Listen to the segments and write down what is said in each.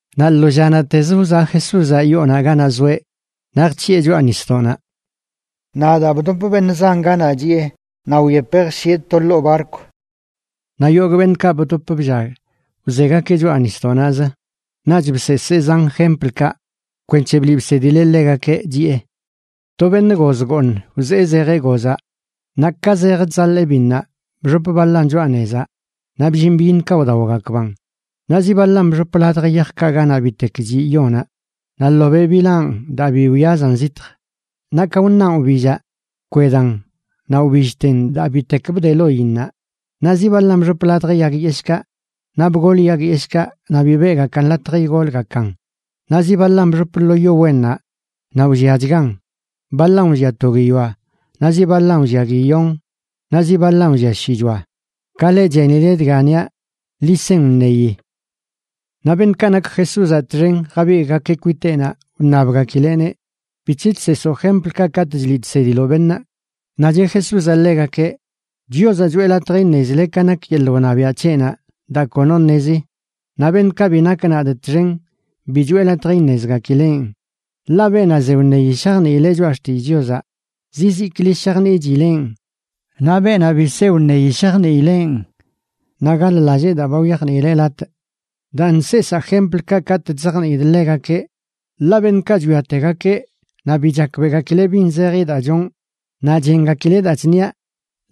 Naꞌ lo llanaꞌtezə wzaꞌ Jesúzaꞌ yoonaꞌ ganaꞌ zoeꞌ naꞌ jc̱hiꞌe choꞌa nisdoꞌnaꞌ. Naꞌ daa bdop beṉꞌ zan ganaꞌ chiꞌe, naꞌ wyepeꞌ jshieꞌ to ḻoo barkw. Naꞌ yogꞌ beṉꞌkaꞌ bdop bllag wzegakeꞌ choꞌa nisdoꞌnaꞌzə. Naꞌch bseesee zan jemplkaꞌ kwenc̱he bliꞌ bsedileꞌ ḻegakeꞌ, chiꞌe: ―To beṉꞌ goz gooṉ wzee zejeꞌ gozaꞌ. Naꞌ ka zej chzaḻee biṉnaꞌ, bxop baḻan choꞌa nezaꞌ naꞌ bllin byiṉkaꞌ wdaogakban. Naꞌ zi baḻan bxop ladj yajkaꞌ ganaꞌ bitek chiꞌ yonaꞌ, naꞌ ḻobeꞌ bilaan daa bi wyazan zitj. Naꞌ ka wṉaꞌn wbillaꞌ, bkwedan naꞌ wbillten daa bitek bde loinnaꞌ. Naꞌ zi baḻan bxop ladj yag yeshꞌkaꞌ, naꞌ bgol yag yeshꞌkaꞌ naꞌ bi beꞌgakan latj igolgakan. Naꞌ zi baḻan bxop lo yo wennaꞌ, naꞌ wlliachgan. Baḻan wllia to guiyoa, naꞌ zi baḻan wllia guiyon naꞌ zi baḻan wllia shichoa. Ka leꞌ chenile dga niaꞌ, ḻi sen wṉeyi. Naꞌ beṉꞌkaꞌ nak Jesúzaꞌ txen jabigꞌgakeꞌ kwiteꞌnaꞌ, wṉabgakileꞌneꞌ: ―¿Bic̱he chseesoo jemplkaꞌ katꞌ chliꞌ chsediloꞌ beṉꞌ? Naꞌ cheꞌ Jesúzaꞌ ḻegakeꞌ: ―Chiozaꞌ choꞌe latj iṉezile ka nak yeḻꞌ wṉabiaꞌ c̱heꞌnaꞌ daa kono ṉezi. Naꞌ beṉꞌkaꞌ bi nak nadꞌ txen, bi choꞌe latj iṉezgakileꞌn. Ḻaꞌ beenaꞌ ze wṉeyi shajniileꞌ Choꞌa Xtillꞌ Chiozaꞌ, zizikli shajniꞌchileꞌn. Naꞌ beenaꞌ bi se wṉeyi shajniileꞌn, naꞌ gaḻ-lallee daa ba wyajniileꞌ latꞌ. Daan chseesaa jemplkaꞌ katꞌ chzajniidꞌ ḻegakeꞌ. Ḻaꞌ beṉꞌkaꞌ chwiategakeꞌ naꞌ bi chakbeꞌgakileꞌ bin zeji daa chonꞌ, naꞌ chengakileꞌ daa chṉiaꞌ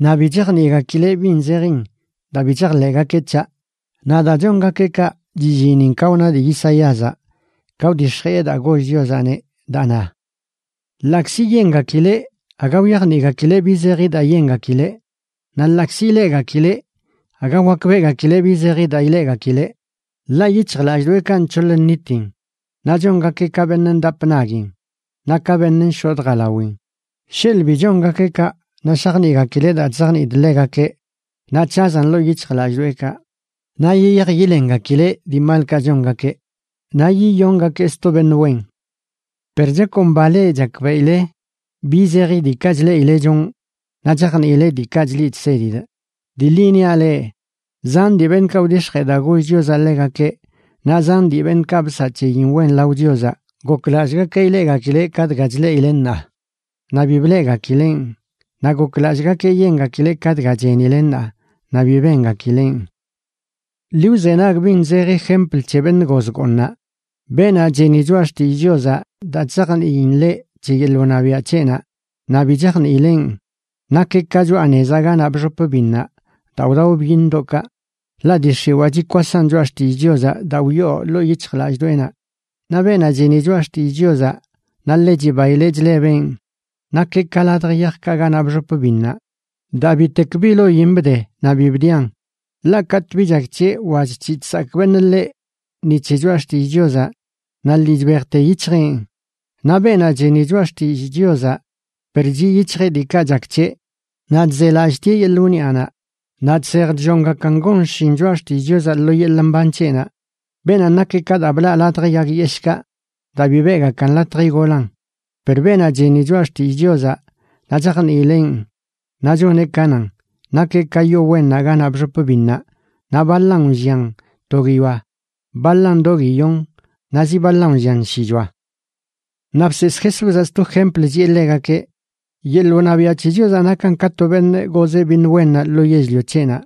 naꞌ bi chajniꞌgakileꞌ bin zejin, daa bi chajḻeꞌgakeꞌ c̱haꞌ. Naꞌ daa chongakeꞌ kaꞌ, chillinin ka wna dii Isaíazaꞌ ka wdix̱jiꞌe daa goll Chiozaꞌneꞌ, daa na: Ḻaꞌkzi yengakileꞌ, aga wyajniꞌgakileꞌ bi zeji daa yengakileꞌ. Naꞌ ḻaꞌkzi ileꞌgakileꞌ, aga wakbeꞌgakileꞌ bi zeji daa ileꞌgakileꞌ. Ḻaꞌ yic̱hjlallꞌdoꞌekaꞌ nc̱hoḻ nnitin, naꞌ chongakeꞌ ka beṉꞌ ndap naguin naꞌ ka beṉꞌ nshodꞌ jalawin. Sheḻꞌ bi chongakeꞌ kaꞌ, naꞌ shajniꞌgakileꞌ daa chzajniidꞌ ḻegakeꞌ naꞌ c̱hazan ḻoo yic̱hjlallꞌdoꞌekaꞌ naꞌ yiyaj yilengakileꞌ dii malkaꞌ chongakeꞌ, naꞌ yiyongakee sto beṉꞌ wen. ’Per chakomba leꞌ chakbeꞌile bi zeji diikaꞌ chleꞌile chonꞌ naꞌ chajniile diikaꞌ chliꞌ chsedidꞌ. Dii ḻi niaꞌ leꞌ, zan dii beṉꞌkaꞌ wdix̱jee daa goll Chiozaꞌ ḻegakeꞌ naꞌ zan dii beṉꞌkaꞌ bsaꞌ c̱heyin wen lao Chiozaꞌ goklallꞌgakeꞌ ileꞌgakileꞌ ka dga chleꞌile ṉaa, naꞌ bi bleꞌgakileꞌn. Naꞌ goklallꞌgakeꞌ yengakileꞌ ka dga chenile ṉaa naꞌ bi bengakileꞌn. ’Ḻi wzenag bin zeji jempl c̱he beṉꞌ goz gooṉaꞌ. Beenaꞌ cheni choꞌa xtillꞌ Chiozaꞌ daa chzajniin ḻeꞌ c̱he yeḻꞌ wṉabiaꞌ c̱heꞌnaꞌ, naꞌ bi chajniileꞌn, nakeꞌ ka choꞌa nezaꞌ ganaꞌ bxop binṉaꞌ daa wdao byiṉdoꞌkaꞌ, ḻaꞌ dii x̱iwaa chikwasan choꞌa xtillꞌ Chiozaꞌ daa wyoo ḻoo yic̱hjlallꞌdoꞌenaꞌ. Naꞌ beenaꞌ cheni choꞌa xtillꞌ Chiozaꞌ naꞌ ḻe chibaileꞌ chlebeꞌn, nakeꞌ ka ladj yajkaꞌ ganaꞌ bxop biṉnaꞌ daa bitek bi loin bde naꞌ bi bdian. Ḻaꞌ katꞌ bi chak c̱heꞌ wa chc̱hiꞌ chsakꞌ beṉꞌ ḻeꞌ ni c̱he choꞌa xtillꞌ Chiozaꞌ, naꞌ lii chbejte yic̱hjeꞌn. Naꞌ beenaꞌ cheni choꞌa xtillꞌ Chiozaꞌ per chiꞌ yic̱hjeꞌ diikaꞌ chak c̱heꞌ naꞌ chzelallꞌtieꞌ yeḻꞌ wniꞌanaꞌ, naꞌ chsej chllongakan gon xshin choꞌa xtillꞌ Chiozaꞌ lo yeḻꞌ mban c̱heꞌnaꞌ. Beenanꞌ nakeꞌ ka daa blaꞌ ladj yag yeshꞌkaꞌ daa bi beꞌgakan latj igolan. Per beenaꞌ cheni choꞌa xtillꞌ Chiozaꞌ naꞌ chajniileꞌn naꞌ choneꞌ ka nan, nakeꞌ ka yo wennaꞌ ganaꞌ bxop biṉnaꞌ, naꞌ baḻan wllian to guiyoa, baḻan do guiyon, naꞌ zi baḻan wllian shichoa. Naꞌ bseesꞌ Jesúzaꞌ sto jempl, chiꞌe ḻegakeꞌ: ―Yeḻꞌ wṉabiaꞌ c̱he Chiozaꞌ nakan ka to beṉꞌ gozeꞌ biṉ wennaꞌ lo yell-lio c̱heꞌnaꞌ.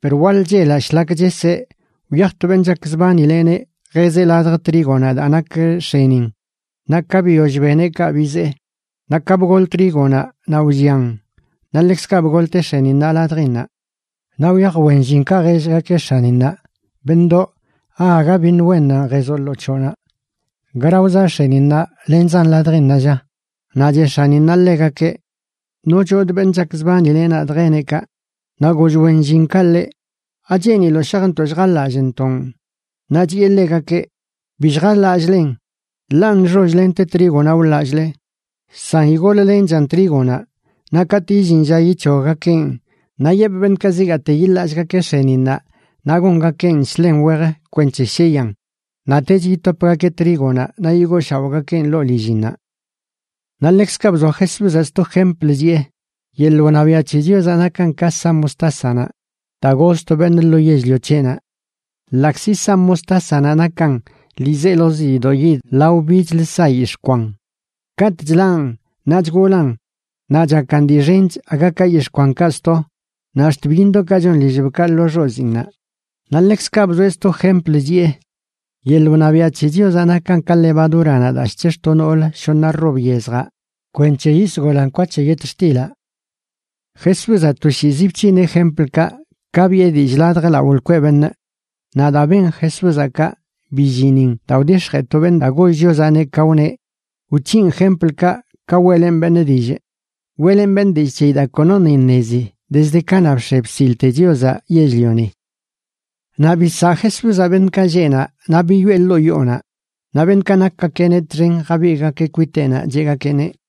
Per waḻ chelaꞌ shlak cheseꞌ, wyaj to beṉꞌ chakzbanileꞌneꞌ jezeꞌ ladj trígonaꞌ daa nak x̱enin, naꞌ ka biyoll beneꞌ kaꞌ bizee. Naꞌ ka bgol trígonaꞌ naꞌ wllian, naꞌ ḻekzkaꞌ bgolte x̱eninnaꞌ ladjinnaꞌ. Naꞌ wyaj wen llinkaꞌ jellgakeꞌ x̱aninnaꞌ: “Beṉꞌdoꞌ, ¿aaga biṉ wennan jezoꞌ lo c̱hoꞌnaꞌ? ¿Gara wzaꞌ x̱eninnaꞌ lenzan ladjinnaꞌ, lla?” Naꞌ cheꞌ x̱aninnaꞌ ḻegakeꞌ: “Nochodꞌ beṉꞌ chakzbanileꞌ nadꞌ jeneꞌ kaꞌ.” Naꞌ goll wen llinkaꞌ ḻeꞌ: “¿Acheeniloꞌ shajntoꞌ lljaḻallꞌntoꞌn?” Naꞌ chiꞌe ḻegakeꞌ: “Bi lljaḻallꞌlen, ḻaꞌ nxoll lente trígonaꞌ wḻallꞌle. San igol-lenchan trígonaꞌ, naꞌ katꞌ illin lla yic̱hoggakeꞌn, naꞌ yepꞌ beṉꞌkaꞌ zigaate yiḻallꞌgakeꞌ x̱eninnaꞌ naꞌ gongakeꞌn shḻen wej kwenc̱he sheyan, naꞌtech yitopgakeꞌ trígonaꞌ naꞌ yigooshaoꞌgakeꞌn ḻoo lillinnaꞌ.” Naꞌ ḻekzkaꞌ bzoa Jesúzaꞌ sto jempl, chiꞌe: ―Yeḻꞌ wṉabiaꞌ c̱he Chiozaꞌ nakan ka sa mostásanaꞌ daa goz to beṉꞌ lo yell-lio c̱heꞌnaꞌ. Ḻaꞌkzi sa mostásanaꞌ nakan ḻiizelozi diidoꞌ yid lao bichlə sa yix̱ꞌ kwan, katꞌ chḻaꞌn naꞌ chgolan naꞌ chakan dii xench aga ka yix̱ꞌ kwankaꞌ sto, naꞌ ax̱t byiṉdoꞌkaꞌ chon lillbkaꞌ lo xoziinnaꞌ. Naꞌ ḻekzkaꞌ bzoeꞌ sto jempl, chiꞌe: ―Yeḻꞌ wṉabiaꞌ c̱he Chiozaꞌ nakan ka levadúranaꞌ daa chc̱hix̱ to noolə shoṉa rob yezjaꞌ kwenc̱he yisgolan kwa c̱he yetxtilaꞌ. Jesúzaꞌ toshiizi bc̱hineꞌ jemplkaꞌ ka biꞌe dillꞌ ladj lao lkweꞌ beṉꞌ. Naꞌ daa ben Jesúzaꞌ kaꞌ, billinin daa wdix̱jee to beṉꞌ daa goll Chiozaꞌneꞌ, ka wneꞌ: Wc̱hinꞌ jemplkaꞌ ka weꞌlenꞌ beṉꞌ dillꞌ. Weꞌlenꞌ beṉꞌ dillꞌ c̱heyi daa konoṉꞌ iṉezi dezd kanaꞌ bx̱e bsilte Chiozaꞌ yell-lioni. Naꞌ bisaꞌ Jesúzaꞌ beṉꞌkaꞌ lleꞌ naꞌ, naꞌ biyoꞌe ḻoo yoonaꞌ. Naꞌ beṉꞌkaꞌ nakgakeꞌneꞌ txen jabigꞌgakeꞌ kwiteꞌnaꞌ cheꞌgakeꞌneꞌ: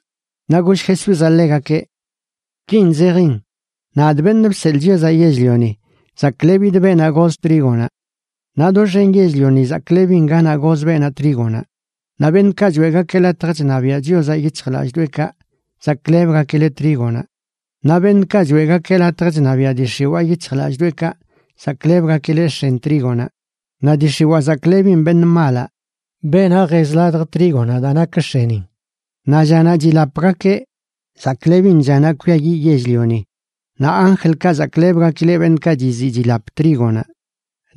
Naꞌ goll Jesúzaꞌ ḻegakeꞌ: ―Kin zejin: Nadꞌ, Beṉꞌ Bseḻꞌ Chiozaꞌ Yell-lioni, zaklebidꞌ beenaꞌ goz trígonaꞌ. Naꞌ doxen yell-lioni zaklebin ganaꞌ goz beenaꞌ trígonaꞌ. Naꞌ beṉꞌkaꞌ choeꞌgakeꞌ latj chṉabiaꞌ Chiozaꞌ yic̱hjlallꞌdoꞌekaꞌ zaklebgakileꞌ trígonaꞌ. Naꞌ beṉꞌkaꞌ choeꞌgakeꞌ latj chṉabiaꞌ dii x̱iwaa yic̱hjlallꞌdoꞌekaꞌ zaklebgakileꞌ x̱en trígonaꞌ. Naꞌ dii x̱iwaa zaklebin beṉꞌ malaꞌ, beenaꞌ jez ladj trígonaꞌ daa nak x̱enin. Naꞌ llanaꞌ chilapgakeꞌ, zaklebin llanaꞌ kwiayiꞌ yell-lioni. Naꞌ anjlkaꞌ zaklebgakileꞌ beṉꞌkaꞌ chiziꞌ chilap trígonaꞌ.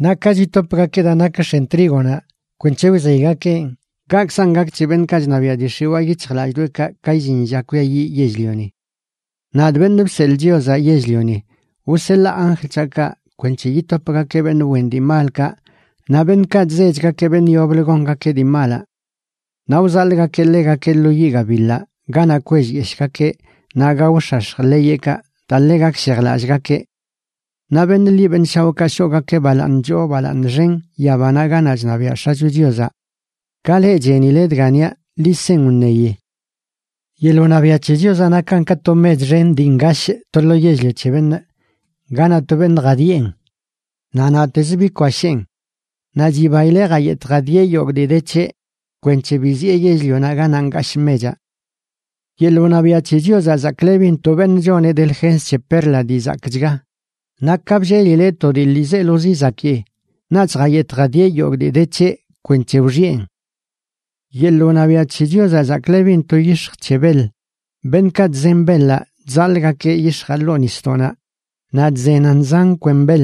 Naꞌ ka chitopgakeꞌ daa nak x̱en trígonaꞌ kwenc̱he wzeygakeꞌn, kaꞌkzan gak c̱he beṉꞌkaꞌ chṉabiaꞌ dii x̱iwaa yic̱hjlallꞌdoꞌekaꞌ ka illin lla kwiayiꞌ yell-lioni. Nadꞌ, Beṉꞌ Bseḻꞌ Chiozaꞌ Yell-lioni, wseḻaa anjl c̱haꞌkaꞌ kwenc̱he yitopgakeꞌ beṉꞌ wen dii malkaꞌ naꞌ beṉꞌkaꞌ chzechgakeꞌ beṉꞌ yoblə gongakeꞌ dii malaꞌ. Naꞌ wzaḻꞌgakeꞌ ḻegakeꞌ lo yiꞌ gabiḻaꞌ ganaꞌ kwellyeshꞌgakeꞌ naꞌ gaox̱ax̱j ḻeyeꞌkaꞌ daa ḻe gakshejlallꞌgakeꞌ. Naꞌ beṉꞌ ḻi beṉꞌ shaoꞌkaꞌ shoꞌgakeꞌ balaaṉ choo balaaṉ xen yabanaꞌ ganaꞌ chṉabiaꞌ X̱acho Chiozaꞌ. Ka leꞌ chenile dga niaꞌ, ḻi sen wṉeyi. ’Yeḻꞌ wṉabiaꞌ c̱he Chiozaꞌ nakan ka to mech xen dii ngashꞌ to lo yell-lio c̱he beṉꞌ ganaꞌ to beṉꞌ jadiꞌen. Naꞌ naꞌtezə bikwasheen, naꞌ chibaileꞌ jayetꞌ jadieꞌ yogꞌ dii de c̱heꞌ kwenc̱he biziꞌe yell-lionaꞌ ganaꞌ ngashꞌ mechaꞌ. ’Yeḻꞌ wṉabiaꞌ c̱he Chiozaꞌ zaklebin to beṉꞌ choneꞌ delgens c̱he perla dii zakꞌchga. Naꞌ ka bllelileꞌ to dii ḻiizelozi zakii, naꞌch jayetꞌ jadieꞌ yogꞌ dii de c̱heꞌ kwenc̱he wxiꞌen. ’Yeḻꞌ wṉabiaꞌ c̱he Chiozaꞌ zaklebin to yix̱j c̱he beḻ. Beṉꞌkaꞌ chzen beḻaꞌ chzaḻꞌgakeꞌ yix̱jaꞌ ḻoo nisdoꞌnaꞌ naꞌ chzenan zan kwen beḻ.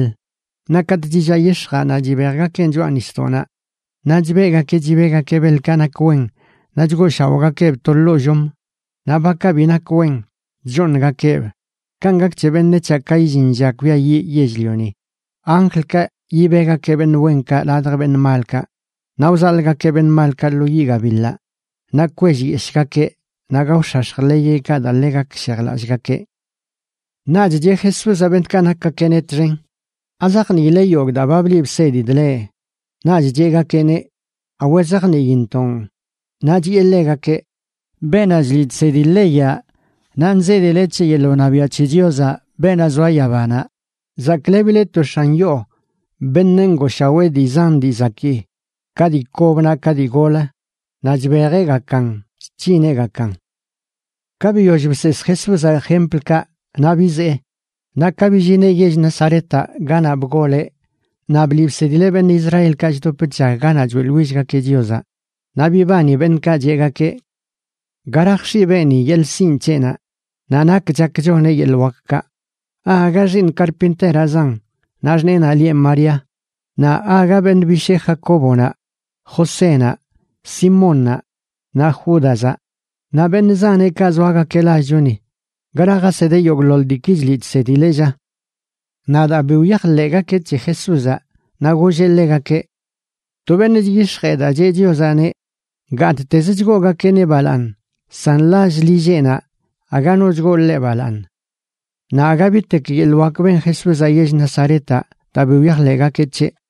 Naꞌ katꞌ chillaꞌ yix̱jaꞌ naꞌ chibejgakeꞌn choꞌa nisdoꞌnaꞌ naꞌ chbeꞌgakeꞌ chibegakeꞌ beḻkaꞌ nak wen naꞌ chgooshaoꞌgakeꞌb to ḻoo llom, naꞌ bakaꞌ bi nak wen, chchooṉgakeꞌb. Kanꞌ gak c̱he beṉec̱haꞌ ka illin lla kwiayiꞌ yell-lioni. Anjlkaꞌ yibegakeꞌ beṉꞌ wenkaꞌ ladj beṉꞌ malkaꞌ, naꞌ wzaḻꞌgakeꞌ beṉꞌ malkaꞌ lo yiꞌ gabiḻaꞌ naꞌ kwellyeshꞌgakeꞌ naꞌ gaox̱ax̱j ḻeyeꞌkaꞌ daa ḻe gakshejlallꞌgakeꞌ. Naꞌch cheꞌ Jesúzaꞌ beṉꞌkaꞌ nakgakeꞌneꞌ txen: ―¿Azajniile yogꞌ daa ba bliꞌ bsedidꞌ leꞌ? Naꞌch cheꞌgakeꞌneꞌ: ―Awe, zajniintoꞌn. Naꞌ chiꞌe ḻegakeꞌ: ―Beenaꞌ chliꞌ chsedi leyaꞌ naꞌ nzedileꞌ c̱he yeḻꞌ wṉabiaꞌ c̱he Chios, beenaꞌ zoa yabanaꞌ, zaklebileꞌ to x̱an yoo beṉꞌ ngooshawee dii zan dii zakii, ka dii kob naꞌ ka dii gol, naꞌ chbejeꞌgakan chc̱hineꞌgakan. Ka biyoll bseesꞌ Jesúzaꞌ jemplkaꞌ, naꞌ bizee. Naꞌ ka billineꞌ yell Nazaretaꞌ ganaꞌ bgoleꞌ, naꞌ bliꞌ bsedileꞌ beṉꞌ Israelkaꞌ chdop chllag ganaꞌ choeꞌḻwillgakeꞌ Chiozaꞌ. Naꞌ bibani beṉꞌkaꞌ, cheꞌgakeꞌ: ―¿Gara jx̱iꞌ beeni yeḻꞌ sinꞌ c̱heꞌnaꞌ, naꞌ nak chak choneꞌ yeḻꞌ wakkaꞌ? ¿Aaga xiiṉ karpinteraꞌzan naꞌ xṉeenaꞌ lieꞌ María? Naꞌ ¿aaga beṉꞌ bishee Jacóbonaꞌ, Josénaꞌ, Simónnaꞌ naꞌ Júdazaꞌ? Naꞌ beṉꞌ zaneꞌkaꞌ zoagakeꞌ lallchoni. ¿Gara jasedeꞌ yogꞌḻoḻ diiki chliꞌ chsedileꞌ, lla? Naꞌ daa bi wyajḻeꞌgakeꞌ c̱he Jesúzaꞌ, naꞌ golleꞌ ḻegakeꞌ: ―To beṉꞌ chyix̱jee daa cheꞌ Chiozaꞌneꞌ, gattez chgoogakeꞌneꞌ balaaṉ san lall lilleꞌnaꞌ aga no chgoo ḻeꞌ balaaṉ. Naꞌ aga bitek yeḻꞌ wak ben Jesúzaꞌ yell Nazaretaꞌ daa bi wyajḻeꞌgakeꞌ c̱heꞌ.